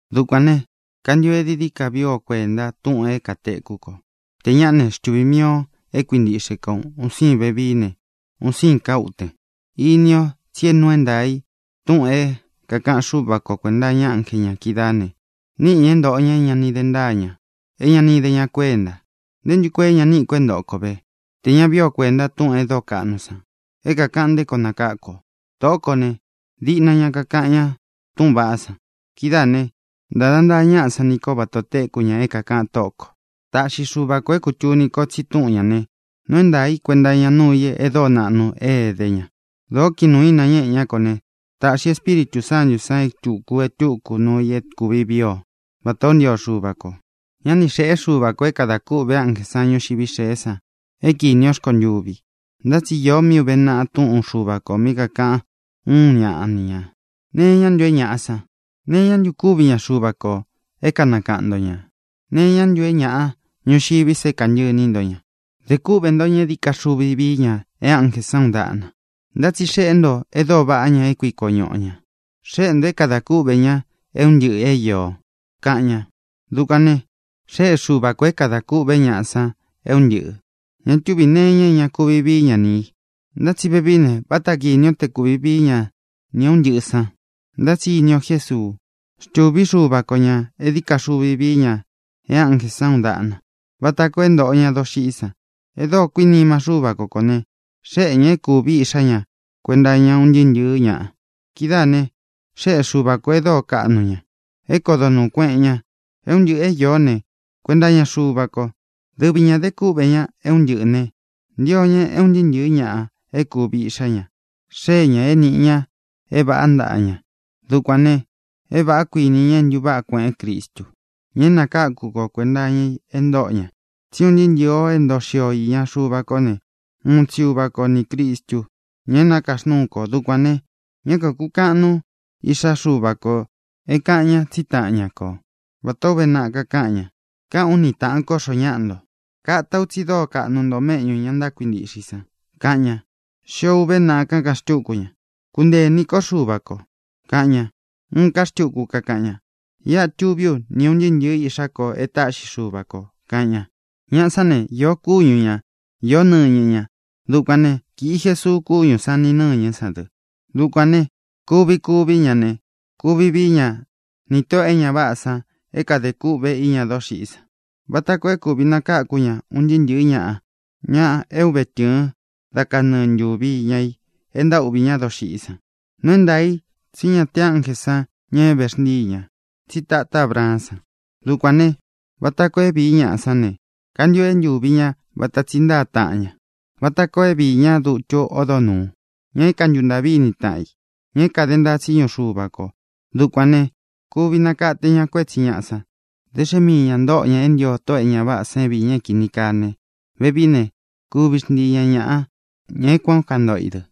Dukuān ne, kantio e dií dií ka vii o kuenta túꞌūn é kātekú kō. Tē ñaꞌá ne, xtuvī mii o é kuintiꞌxe ko un sīin vevií ne, un sīin ká uten. Ini ó tsi é nuu é ntaā i túꞌūn é kākaꞌan Xúva ko kuēnta iña ánje ñā kídaā ne, níꞌi ñāꞌa é ntōꞌo ña é ña ni de ntáa ña, é ña ni ide ña kuénta. ¿Nté ntu koo é ña níꞌi kō é ntoꞌo ko ve, tē ña vií o kuēnta túꞌūn e dóo kaꞌnu san é kākaꞌan nté koo nakáku ō? Tōꞌó kō ne, diꞌna ña kakaꞌan ñá túꞌūn vaꞌá san. Kidáā ne, ntáda ntaa ñaꞌa san ní ko vata ō téku ña é kākaꞌan Tóꞌo kō. Taꞌxi Xuva kō é kūtuni ko tsi túꞌūn ñá ne, nuu é ntaā i, kuenta iña nuu i e dóo naꞌnu e éde ña. Dōó kiꞌin nuū í nañéꞌe ñá kō ne, tāꞌxi Espíritū Sántū san e túku e túku nuu i é kūvi vii ó, vatā ó ntio Xuva kō. Ñá ni xēꞌé Xuva kō é kadā kûꞌve ánjē san ñuxiví xēé san é kīni ó rkontuvi. Ntá tsi īó mí uve naꞌa túꞌun Xuva kō mí kakāꞌan úun ñaꞌa ni ñā: ¿Nee iñá ntu é ñāꞌa san, nee iñá ntu kuvi ña, Xuvā ko, é kanakaꞌan nto ñā? ¿Nee iñá ntu é ñāꞌa ñuxiví sa é kāntɨꞌɨ ini nto ña? Dē kúꞌvē ntó ña é dií ka xuvi vií ña e ánjē san uun daꞌna, ntá tsi xeꞌé nto e dóo vaꞌá ña, é kuiko ñuꞌu o ñā. Xéꞌe ntō é kāda kúꞌvē ña é un ntɨꞌɨ̄ é īo, kaꞌan ña. Dukuān ne, xéꞌe Xuva kō é kāda kûꞌvé ñaꞌa san é un ntɨꞌɨ̄. Ña túvī nee iña é ña kuvi vií ña ni ī. Ntá tsi vevií ne, váta kīni o te kuvi vií ña nī é un ntɨꞌɨ̄ san. Ntá tsi ini o Jésuu. Xtûví Xuva ko ñā é dií ka xuvi vií ña e ánjē san uun daꞌna, vata koo é ntōꞌo ña doxiꞌí san. E dóo kuinima Xúva ko kō ne, xéꞌe ñā é kūví Iꞌxá ña kuenta iña ún ntɨɨ́ ntɨ̄ɨ́ ñaꞌa. Kidáā ne, xéꞌe Xuva kō e dóo kaꞌnu ña, é kodo nūú kueꞌen ña. É un ntɨꞌɨ̄ é īó ne, kuenta iña Xuva ko. Dɨvi ñā de kúꞌvē ña é un ntɨꞌɨ̄ ne, ntio ña é un ntɨɨ́ ntɨ̄ɨ́ ñaꞌa e kúvi iꞌxá ña xee ña é nīꞌi ña é vāꞌá ntaꞌa ña. Dukuān ne, é vāꞌá, kuinī ña, é ntuváꞌa kueꞌen Cristu, ña é nakáku ko, kuēnta iña i e ntóꞌo ña. Tsí un ntɨɨ́ ntɨ̄ɨ o é ntoo xio o īña Xuva kó ne, uun tsi Uva ko nī Cristu, ña é nakaxnúu kō. Dukuān ne, ñá kākukaꞌan nuu Iꞌxá Xuva kō é kāꞌan ña tsí taꞌan ña ko, vatā ó uve naꞌa kakáꞌan ña: Káꞌān ú ni tāꞌan kó xōo ñáꞌa nto. Kata u tsi dóo kaꞌnu nto méꞌñū ña ntákuintiꞌxe i san, kaꞌan ña. Xio uve naꞌa kakaꞌan xtúku ña: Kuntee iní ko Xuvā ko, kaꞌan ña. Uun ká xtuku kakaꞌan ña: Iꞌa tuví u ni ūn ntɨɨ́ ntɨ̄ɨ́ iꞌxá ko e táꞌxi Xuva kō, kaꞌan ña. Ñaꞌa sán ne, īo kúñu ña, īó nɨñɨ ña. Dukuān né, kīꞌi Jesuu kúñū san ni nɨ̂ñɨ́ san dɨ. Dukuān ne, kuvi kuví ña ne, kuvi vií ña nī tóꞌō e ña váꞌā san é kāde kûꞌvé iñá doxiꞌí san, vata koo é kūvi nakáku ña un ntɨɨ́ ntɨ̄ɨ́ ñaꞌa, ña é ūve tɨɨn dá kanɨɨ̄ ntuvi iña i e ntaúꞌvī ñá doxiꞌí san. Nuu é ntaā i tsí ñá te ánjē san ña é vexntíi ñā, tsí tatá Abraán san. Dukuān ne, vata koo é viī ña sáꞌā ne, kantio é ntūvi ña vata tsi ntáa taꞌan ña, vata koo é viī ñá dutu ódo nūu, ña é kāntuntaꞌví ini i taꞌan i, ña é kāde ntaa tsíñu Xuva kō. Dukuān ne, kuvi nakate ña kuétsi ñāꞌa san. Da xe é mii ñā ntóꞌo ña e ntío tóꞌō e ña váꞌā san é viī ña é kīni kaa ne, vevií ne, kuvi xntii ña ñāꞌa, ña é kuān o ntántoꞌo i dɨ.